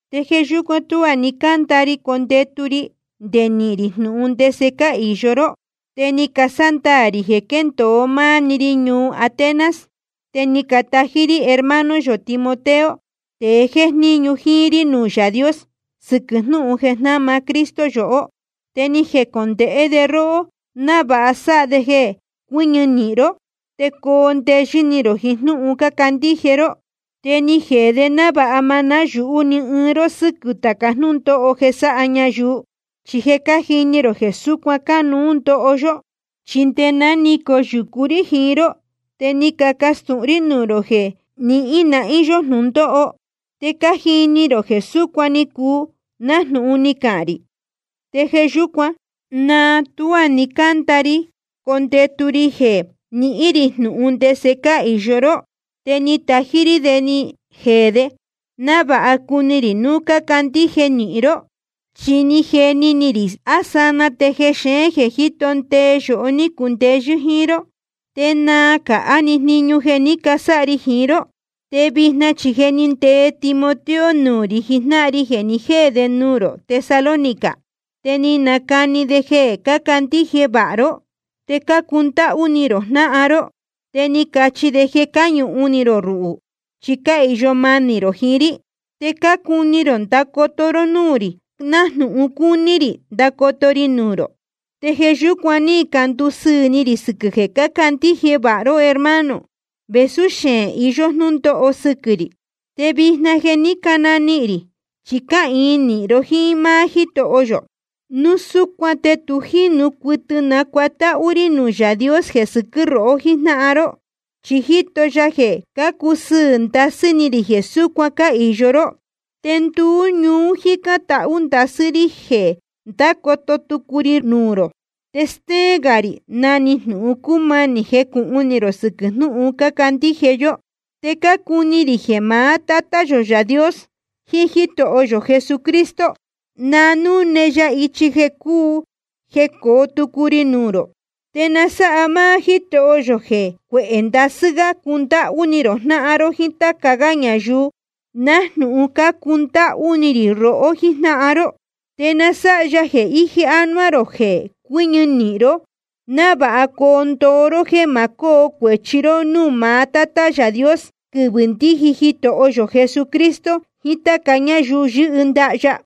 Te jeē yúcuan tuá ni cácanda ri condetu ri nde nihīn rī jnūhun ndese cáhīyo ró. Te ni casándaā rī jeē quéndōo máá‑ni ri ñuu Atenas. Te ni catají rí hermano yō Timoteo, tēe jéjníñu jíín rí nuū Yaā Dios sɨquɨ̄ jnúhun jeē jnáma Cristo yohó. Te ni jecondēhé de róhó návāha sáha de jeē cuɨñɨ nīhin ró te coo ndeyɨ́ ni rō jiín jnúhun cácandíje ró. Te ni jeē de návāha ma náyūhú ni ɨɨn ró sɨ́quɨ̄ tāca jnúndóho jeē sáha ñayuu. Chi je cájini rō jeē súcuan cánuú ndoho yó. Chi nde ná ni coyūcu rí jiín ró, te ni cacastūhun rí nuū rō jeē nihīn nahín yó jnūndóho. Te je cájini rō jeē súcuan ni cuu, nájnūhun ni cacahān rī. Te jeē yúcuan, náa tuá ni cánda ri condetu ri jeē nihín rī jnūhun ndese cáhīyo ró, te ni tají rí de ni jeē de, návāha cuni rī núu cácandíje nahín ró. Chi ni jeni ni rī á sanaa te jexeén jeē jíto ndee yohó ní cundeyɨ́ jíín ró, te naa cāhá‑ni jniñu jeē ní casáha ri jiín ró. Te vijna chi je ni ndee Timoteo nuū rī jijnáhan ri jeē ni jéē de ñuu rō Tesalónica. Te ni nacani de jeē cácandíje vāha ró, te cácundáhú ni rō jnáhan ró. Te ni cachi de jeē cáñuhun ni rō ruhū, chi cáhīyo manī rō jiín rí. Te cácuni rō ndacoto ró núū rī, nájnūhun cácuni rī ndacoto ri nuū rō. Te jeē yúcuan ní candusɨɨ̄ ni rī sɨquɨ̄ jeē cácandíje vāha ró, hermano, vēsú xeēn iyó jnūndóho sɨquɨ̄ rī. Te vijna je ni cananihīn ni rī, chi cáhīin nīhin ró jíín máá Jítoho yō. Núu súcuan te tu jínu cuɨtɨ nacuatáhú rí nuū Yaā Dios jeē sɨquɨ́ rohó jijnáhan ró. Chi jíto ya jeē cácusɨɨ̄ ndasɨ́ ni rī jeē súcuan cáhīyo ró. Te nduú ñuú cájicān tahú ndasɨ́ rí jeē ndácoto tucu ri nuū rō, te stéén gā rī na‑ni jnūhun cúmanī jecūhun ni rō sɨquɨ̄ jnúhun cácandíje yó. Te cácuni rī jeē maá Tátá yō Yaā Dios jiín Jítoho yō Jesucristo, na núne ya ichi jeē cuu jecoo tucu ri nuū rō. Te na sáha máá Jítoho yō jeē cuehē ndasɨ́ gá cundáhú ni rō jnáhan ró jíín táca gá ñayuu, nájnūhun cácundáhú ni rī rohó jíjnáhan ró. Te na sáha ya jeē íje ánuá rō jeē cuɨñɨ nīhin ró, návāha coo ndoo ró jéē ma cóo cuēchi ró núū maá Tátá yō Yaā Dios, quɨvɨ̄ ndíji Jitoho yō Jesucristo jiín táca ñáyuu yɨ́hɨ ndaha ya.